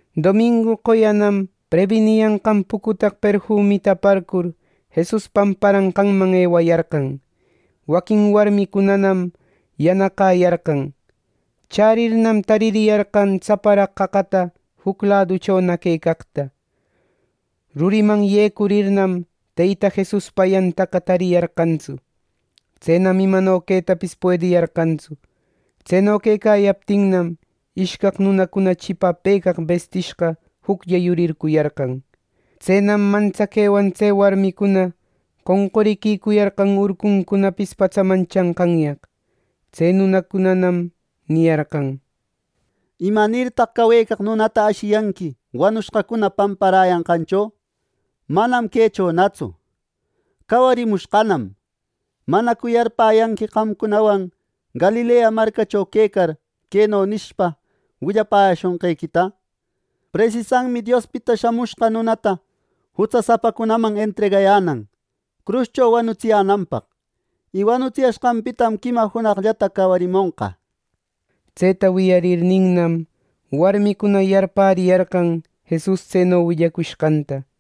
Domingu qoyanam prebiniyanqan pucutaq perfumita aparcur, Jesus pamparanqanman ewayarqan. ˻Waquin warmicunanam yanaqäyarqan.˼ Chärirnam, taririyarqan tsaparaq qaqataqa juc laduchona quecaqta. Ruriman yecurirnam, Teyta Jesuspa ayantaqa tariyarqantsu. Tsenam imano quetapis puediyarqantsu. Tseno quecayaptinnam, ishcaq nunacuna chipapëcaq bestishqa juclla yuripicuyarqan. Tsenam mantsaquewan tse warmicuna qoncuriquicuyarqan urcuncunapis patsaman chanqanyaq. Tse nunacunanam niyarqan: —¿Imanirtaq cawecaq nunata ashiyanqui wanushqacuna pamparäyanqancho? Manam quechonatsu; cawarimushqanam. ¿Manacu yarpäyanqui qamcunawan Galilea marcacho quecar, queno nishpa willayäshonqequita? ‘Presisanmi Diospita Shamushqa Nunata jutsasapacunaman entregayänan cruscho wanutsiyänanpaq. Y wanushqanpitam quima junaqllata cawarimonqa’ nir. Tseta wiyarirninnam, warmicuna yarpäriyarqan Jesus tseno willacushqanta.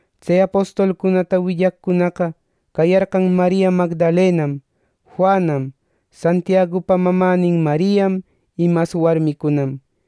Tse apostolcunata willaqcunaqa cayarqan Maria Magdalenam, Juanam, Santiagupa mamänin Mariam y mas warmicunam.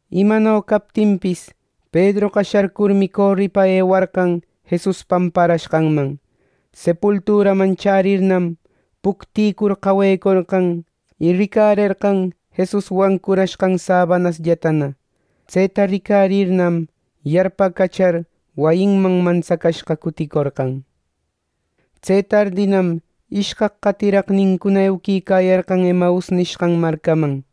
Imano captinpis, Pedroqa sharcurmi coripa ewarqan Jesus pamparashqanman. Sepulturaman chärirnam, puctïcur qawecorqan y ricarerqan Jesus wancurashqan sabanasllatana. Tseta ricarirnam, yarpacachar wayiman mantsacashqa cuticorqan. Tse tardinam, ishcaq qatiraqnincuna euquicayarqan Emaus nishqan marcaman.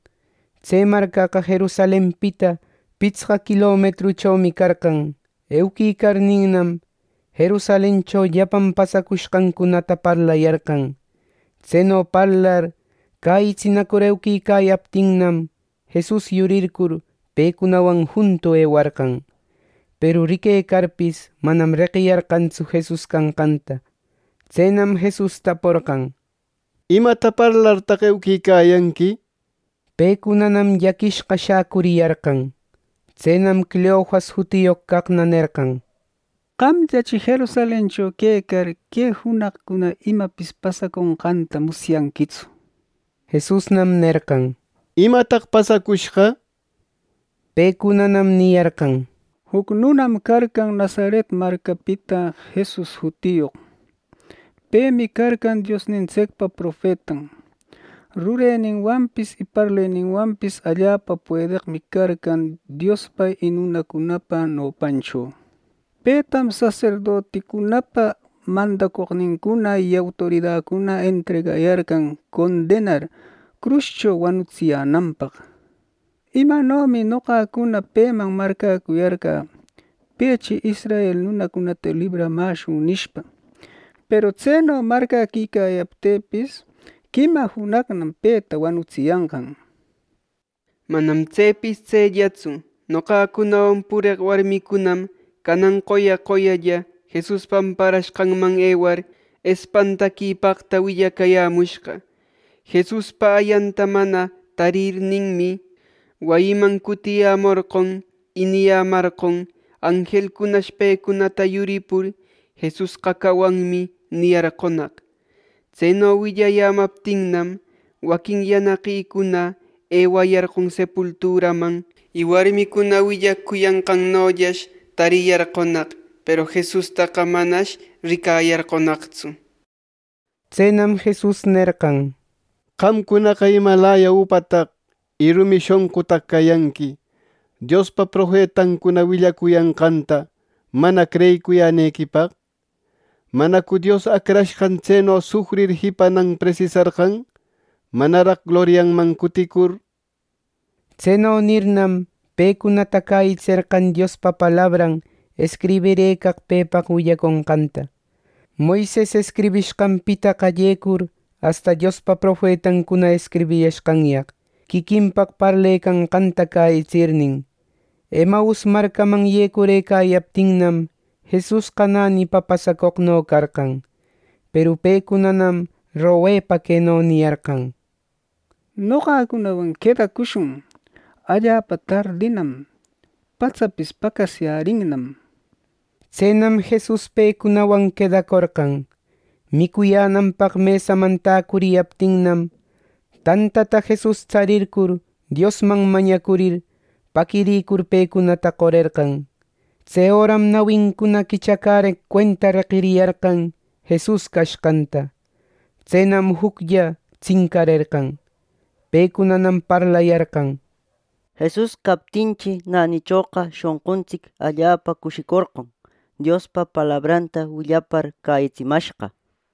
Tse marcaqa Jerusalenpita pitsqa quilometruchomi carqan. Euquicarninnam, Jerusalencho llapan pasacushqancunata parlayarqan. Tseno parlar cäyitsinacur ewecayaptinnam, Jesus yurircur pecunawan juntu ewarqan. Peru riquecarpis, manam reqiyarqantsu Jesus canqanta. Tsenam Jesus taporqan: —¿Imata parlartaq euquicayanqui? —nir. Pecunanam llaquishqa shäcuriyarqan. Tsenam Cleofas jutiyoq caqna nerqan: —Qamllachi Jerusalencho quecar, ¿que junaqcuna imapis pasaconqanta musyanquitsu? Jesusnam nerqan: —¿Imataq pasacushqa? Pecunanam niyarqan: —Juc nunam carqan Nazaret marcapita Jesus jutiyoq. Pemi carqan Diosnintsicpa profetan. Rureninwanpis y parleninwanpis allapa puedeqmi carqan Diospa y nunacunapa nopancho. Petam saserdoticunapa mandacoqnincuna y autoridacuna entregayarqan condenar cruscho wanutsiyänanpaq. “Imanomi noqacuna peman marcäcuyarqä, ‘pechi israel nunacunata libramäshun’ nishpa. Peru tseno marcäquicayaptïpis, quima junaqnam peta wanutsiyanqan. Manam tsepis tsellatsu. Noqacunawan pureq warmicunam canan qoya qoyalla Jesus pamparashqanman ewar, espantaquipaqta willacayämushqa. Jesuspa ayanta mana tarirninmi, wayiman cutiyämorqon. Y niyämarqon anjelcunash pecunata yuripur, ‘Jesusqa cawanmi’ niyarqonaq. Tseno willayämaptinnam, waquin yanaqicuna ewayarqon sepulturaman, y warmicuna willacuyanqannollash tariyarqonaq. Peru Jesustaqa manash ricayarqonaqtsu” nir. Tsenam Jesus nerqan: —¡Qamcunaqa imalaya upataq y rumi shonqutaq cayanqui Diospa profetancuna willacuyanqanta mana creyicuyänequipaq! ¿Manacu Dios Acrashqan tseno sufrir jipanan presisarqan, manaraq glorianman cuticur! —nir. Tseno nirnam, pecunata cäyitserqan Diospa palabran escribirëcaq pepaq willaconqanta. Moises escribishqanpita qallecur, asta Diospa profetancuna escribiyashqanyaq quiquinpaq parlecanqanta cäyitsirnin. Emaus marcaman yecurëcayaptinnam, Jesusqa nänipa pasacoqno carqan. Peru pecunanam mañepa queno niyarqan: —Noqacunawan quedacushun. Allapa tardinam, patsapis paqasyärinnam. Tsenam Jesus pecunawan quedacorqan. Micuyänanpaq mesaman täcuriyaptinnam, tantata Jesus tsarircur, Diosman mañacurir, paquirïcur pecunata qorerqan. Tse öram nawincuna quichacäreq cuenta reqiriyarqan Jesus cashqanta. Tsenam juclla tsincarerqan. Pecunanam parlayarqan: —Jesus captinchi, nänichoqa shonquntsic allapa cushicorqon, Diospa palabranta willapar cäyitsimashqa —nir.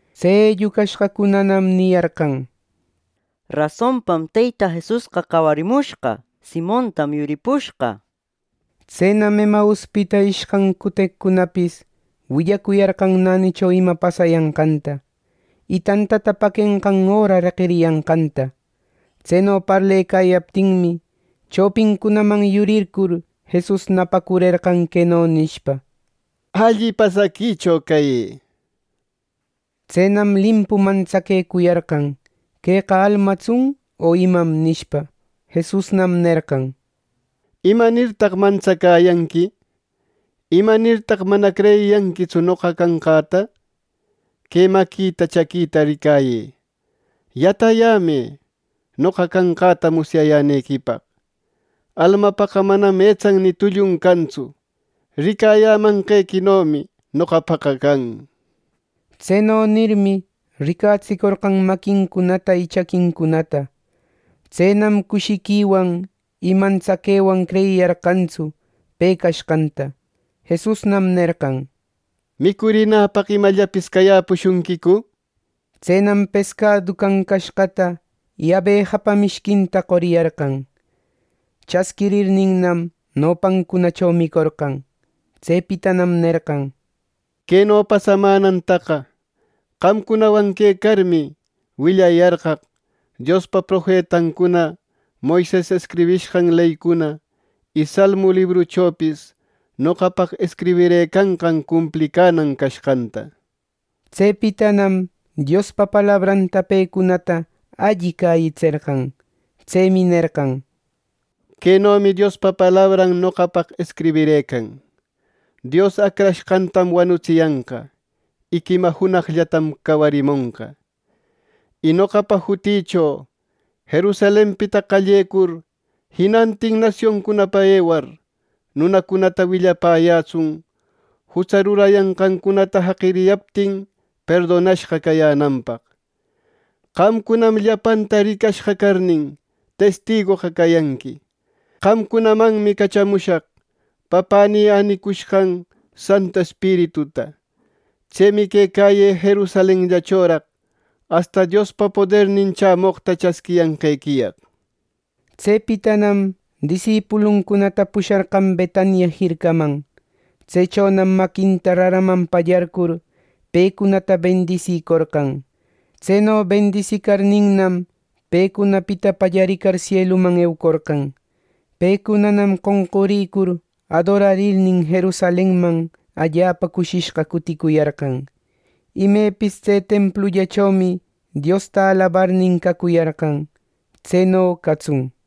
Tse ellucashqacunanam niyarqan: —Rasonpam Teyta Jesusqa cawarimushqa. Simontam yuripushqa. Tsenam Emauspita ishcan cuteqcunapis willacuyarqan nänicho ima pasayanqanta, y tantata paquenqan öra reqiriyanqanta. Tseno parlecayaptinmi, chopincunaman yurircur Jesus napacurerqan queno nishpa: —Alli pasaquicho cayë —nir. Tsenam limpu mantsaquecuyarqan “¡Queqa almatsun o imam!” nishpa. Jesusnam nerqan: —¿Imanirtaq mantsacäyanqui? ¿Imanirtaq mana creyiyanquitsu noqa canqäta? Que maquïta, chaquïta ricayë. Yatayämë, noqa canqäta musyayänequipaq. Almapaqa manam etsan ni tullun cantsu. Ricayämanqequinomi noqapaqa can —nir. Tseno nirmi, riquetsicorqan maquincunata y chaquincunata. Tsenam cushiquiwan y mantsaquewan creyiyarqanraqtsu pe cashqanta. Jesusnam nerqan: —¿Micurinäpaq imallapis cayäpushunquicu? —nir. Tsenam pescadu cancashqata ˻y abejapa mishquinta˼ qoriyarqan. Chasquirirninnam, nopancunacho micorqan. Tsepitanam nerqan: —Queno pasamänantaqa, qamcunawan quecarmi, willayarqaq Diospa profetancuna, Moises escribishqan leycuna, y salmu libruchopis noqapaq escribirëcanqan cumplicänan cashqanta. Tsepitanam Diospa palabranta pecunata alli cäyitserqan. Tsemi nerqan: —Quenomi Diospa palabran noqapaq escribirëcan: ‘Dios Acrashqantam wanutsiyanqa. Y quima junaqllatam cawarimonqa.’ Y noqapa jutïcho Jerusalenpita qallecur jinantin nasioncunapa ewar, nunacunata willapäyätsun jutsa rurayanqancunata jaqiriyaptin perdonashqa cayänanpaq. Qamcunam llapanta ricashqa carnin, testigoqa cayanqui. Qamcunamanmi cachamushaq Papänï änicushqan Santu Espirituta. Tsemi quecäyë Jerusalenllachoraq asta Diospa podernin chämoqta chasquiyanqequiyaq. Tsepitanam disipuluncunata pusharqan Betania jircaman. Tsechonam maquinta raraman pallarcur, pecunata bendisicorqan. Tseno bendisicarninnam, pecunapita pallaricar, sieluman eucorqan. Pecunanam qonqurïcur adorarirnin, Jerusalenman allapa cushishqa cutïcuyarqan. Imepis tse templullachomi Diosta alabarnin, cacuyarqan. ˻Tseno catsun.˼